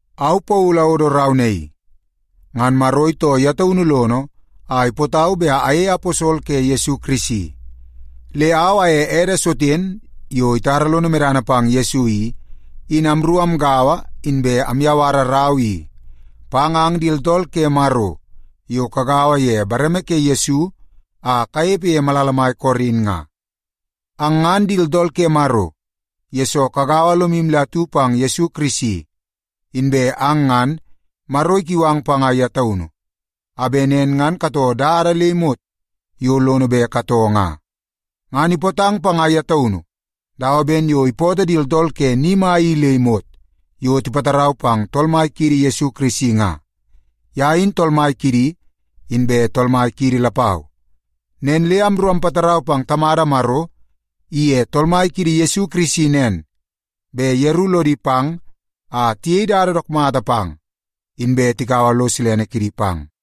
Au Paulu awodo rau naii. Ngan Maro itoo ye taunu lono a ipootau bet ayei aposol ke Yesu Kirisi. Le au aye ede Soten yo itara lono medana pang Yesu i, in amru amgaua inbe amyawara rau naii pang ang di tooltool ke Maro yo kagaua ye bareme ke Yesu a kanepe ye malala mai Korin nga. Ang ngan di tooltool ke Maro, yesoo kagaua lomu le atu pang Yesu Kirisi. Inbe ang ngan, Maro ikiu ang panga ye taunu, a bet nen ngan katoo dada le imot yo lono bet katoo nga. Ngan ipootang panga ye taunu dawa ben yo ipootoo di tooltool ke ni mai i le imot yo tipatarau pang Tool Mai kiidi Yesu Kirisi nga. Ye in Tool Mai kidi, inbe Tool Mai kiidi lapau. Nen le amru ampatarau pang Tamada Maro iye Tool Mai kiidi Yesu Kirisi nen, bet yeru lodi pang a tiyei dada dook mata pang, inbe tikaua lo silene kidi pang.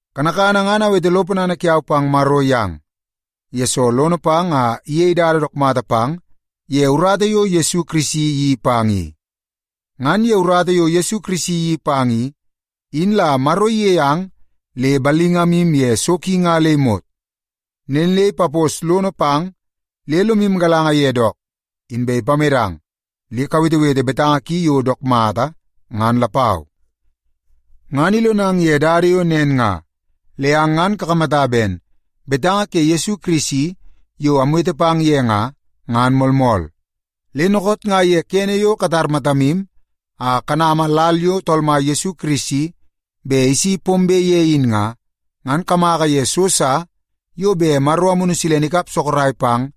Kanakana ngan awete lo ponana kiau pang Maro yang, yesoo lono pang a iyei dada dook mata pang ye urata yo Yesu Kirisi iyeii pang i. Ngan ye urata yo Kirisi iyeii pang i, in la Maro iyei ang le ballingamu ye so ki nga le imot. Nen le ipapos lono pang le lomu galanga ye dook, inbe ipamedang le kawetewete betanga ki yo dook mata, ngan lapau. Ngan ilonang ye dada yo nen nga le ang ngan kakamata ben betanga ke Yesu Kirisi yo amwete pang ye nga, ngan moolmool. Le dookoot nga ye kene yo katar matamu a kanama lal yo Tool Mai Yesu Kirisi bet isi pombe ye in nga, ngan kamaka ye so sa yo bet Maro Amunu Silene ikap sorok pang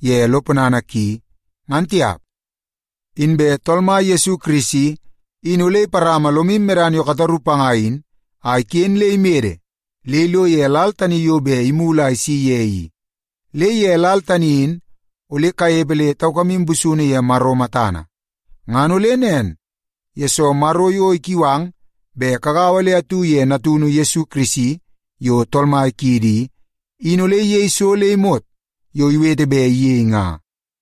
ye lo ponana ki, ngan tiap. Inbe Tool Mai kiidi Yesu Kirisi in ole iparama lomu medana yo kataru panga in a iken le imede le ilo ye lal tani yo bet imulu a isi ye i. Le ye lal tani in ole kanepe le taukamu busunu ye Maro matana. Ngan ole nen, yesoo Maro yo ikiu ang bet kagaua le atu ye Natunu Yesu Kirisi yo Tool Mai kiidi i, in ole iyei so le imot yo iwete bet iyei nga.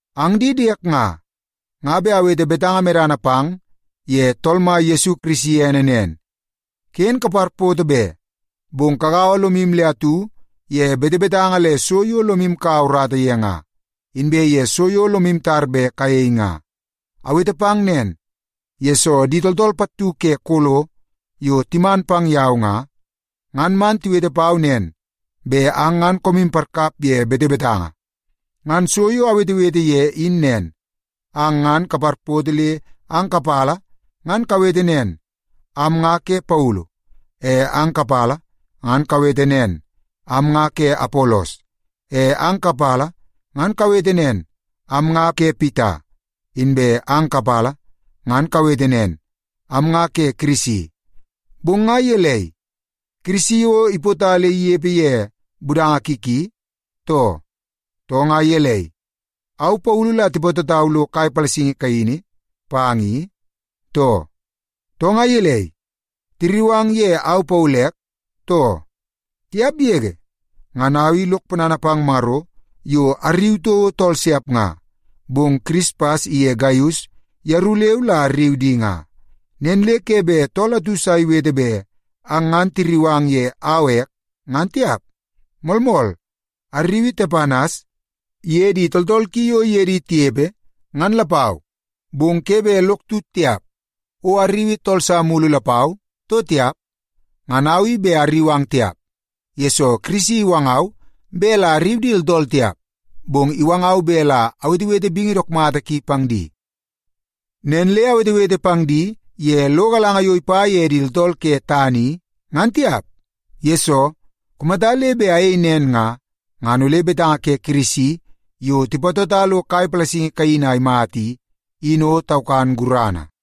Ang di diek nga, nga bet awete betanga medana pang ye Tool Mai kiidi Yesu Kirisi ene nen. Ken kaparpoto be, bong kagaua lomu le atu ye betebetanga le so yo lomu kaua urata ye nga, inbe ye so yo lomu tar bet kayei nga. Awete pang nen, yesoo di tooltool pattu ke Kolo yo timan pang yau nga, ngan man tiwete pau nen bet ang ngan koomu parkap ye betebetanga. Ngan so yo awetewete ye in nen, ang ngan kaparpoto le ang kapala ngan kawete nen, “Am nga ke Paulu.” E ang kapala ngan kawete nen, “Am nga ke Apolos.” E ang kapala ngan kawete nen, “Am nga ke Pita.” Inbe ang kapala ngan kawete nen, “Am nga ke Kirisi.” Bong nga gelei, Kirisi o ipota le inepe ye budanga ki ki, too? Too nga gelei, au Paulu la tipatotau lo kai palasingi kaini pang i, too? Too nga gelei, tirriu ang ye au Paulu ek, too? Tiap yege! Ngan au i lok ponana pang Maro yo arriu toko tool siap nga, bong Kirispas iye Gaius yeru leu la arriu di nga. Nen le ke bet tool atu sa iwete bet ang ngan tirriu ang ye au ek, ngan tiap. Moolmool, arriui Tepanas iye di tooltool ki yo iye di tinepe, ngan lapau. Bong ke bet lok tut tiap, o arriui tool sa mulu lapau, too tiap. Ngan au i bet arriu ang tiap, yesoo Kirisi iwangau bet la arriu di tooltool tiap, bong iwangau bet la awetewete bingi dook mata ki pang di. Nen le awetewete pang di ye lo galanga yo ipa ye di tooltool ke tana i, ngan tiap. Yesoo, kumata le bet ayei nen nga, ngan ole betanga ke Kirisi yo tipatota lo kai palasingi kaini a imata i, in o taukan gurana.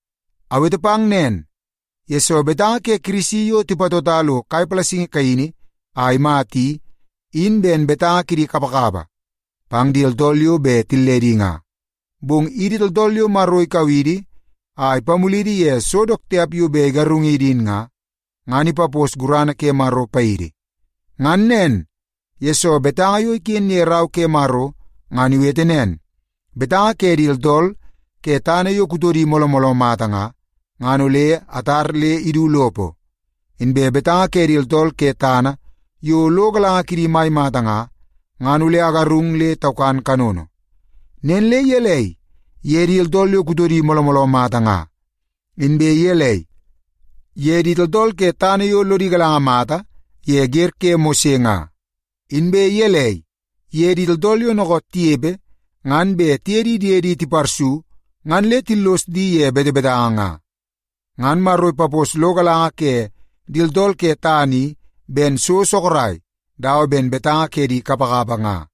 Awete nen, yesoo betanga ke Kirisi yo tipatota lo kai palasingi kaini a imata i, in ben betanga kidi kapakapa pang di tooltool yo bet tilledi nga. Bong idi tooltool yo Maro ikau idi a ipamulidi ye so dook tiap yo bet igarungidi in nga, ngan ipapos gurana ke Maro paidi. Ngan nen, yesoo betanga yo iken ye Rau ke Maro ngan iwete nen, “Betanga ke di tooltool ke tana yo kutodi mooloo mooloo mata nga, ngan ole atar le idu lopo. Inbe betanga ke di tooltool ke tana yo lo galanga kidi mai mata nga, ngan ole agarung le taukan kanono.” Nen le gelei ye di tooltool yo kutodi mooloo mooloo mata nga? Inbe gelei ye di tooltool ke tana yo lodi galanga mata ye wer ke Mose nga? Inbe gelei ye di tooltool yo dookoot tinepe ngan bet tiye di diedi tiparsu ngan le tillos di ye betebetanga nga? Ngan Maro ipapos lo galanga ke di tooltool ke tana i ben so sorok dawa ben betanga ke di kapakapa nga.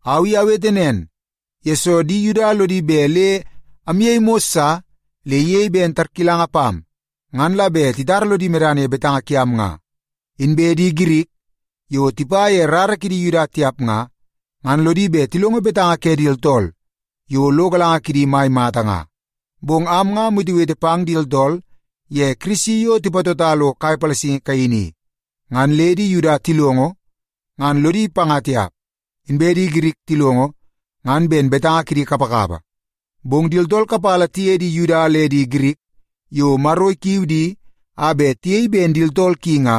Au i awete nen, yesoo di Yuda lodi bet le amyei mos sa le iyei ben tarkilanga pam ngan la bet titara lodi medana ye betanga kiam nga. Inbe di Girik yo tipa ye rara kidi Yuda tiap nga, ngan lodi bet tilongo betanga ke di tooltool yo lo galanga kidi mai mata nga. Bong am nga amwetewete pang di tooltool ye Kirisi yo tipatota lo kai palasingi kaini i. Ngan le di Yuda tilongo betanga tina ngan lodi panga tiap. Inbe di Girik tilongo ngan ben betanga kidi kapakapa. Bong di tooltool kapala tiye di Yuda le di Girik yo Maro ikiu di a bet tiyei ben di tooltool ki nga,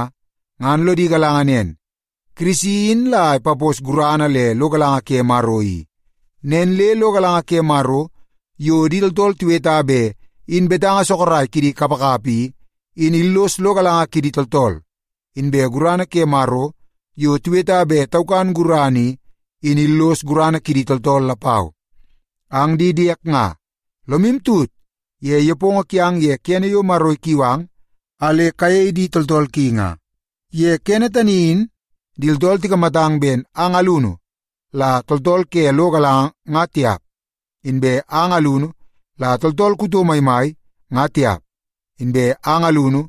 ngan lodi galanga nen, Kirisi in la ipapos gurana le lo galanga ke Maro i. Nen le lo galanga ke Maro yo di tooltool tiweta bet in betanga sorok kidi kapakapa i, in illos lo galanga kidi tooltool. Inbe gurana ke Maro yo tiweta bet taukan gurana i, in illos gurana kidi tooltool lapau. Ang di diek nga, lomu tut ye nepongo kiang ye kene yo Maro ikiu ang a le kayei di tooltool ki nga. Ye kene tani in di tooltool tikamatang ben ang alunu la tooltool ke lo galanga nga tiap. Inbe ang alunu la tooltool kuto maimai nga tiap, inbe ang alunu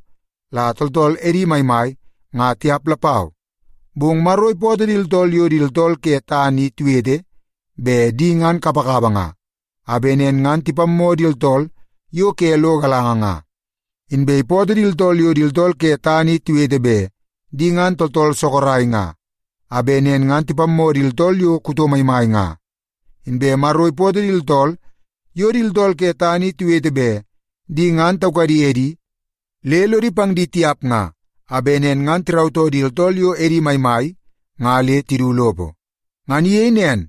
la tooltool edi maimai nga tiap lapau. Bong Maro ipootoo di tooltool yo di tooltool ke tana i tiwete bet di ngan kapakapa nga, a bet nen ngan tipammoo di tooltool yo ke lo galanga nga. Inbe ipootoo di tooltool yo di tooltool ke tana i tiwete bet di ngan di tooltool sorok nga, a bet nen ngan tipammoo di tooltool yo kuto maimai nga. Inbe Maro ipootoo di tooltool yo di tooltool ke tana i tiwete bet di ngan taukadi edi le lodi pang di tiap nga, a bet nen ngan tirautoo di tooltool yo edi maimai nga le tidu lopo. Ngan iyei nen,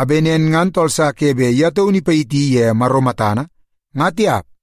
a bet nen ngan tooltool sa ke bet ye taunu ipayiti ye Maro matana, ngan tiap.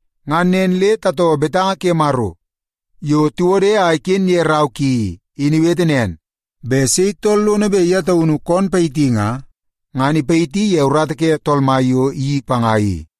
Ngan nen le tatoo betanga ke Maro yo tiwode a iken ye rau ki i, in iwete nen, “Bet sei tool lono bet ye taunu kon payiti nga, ngan ipayiti ye urata ke Tool Mai yo iyeii panga i.”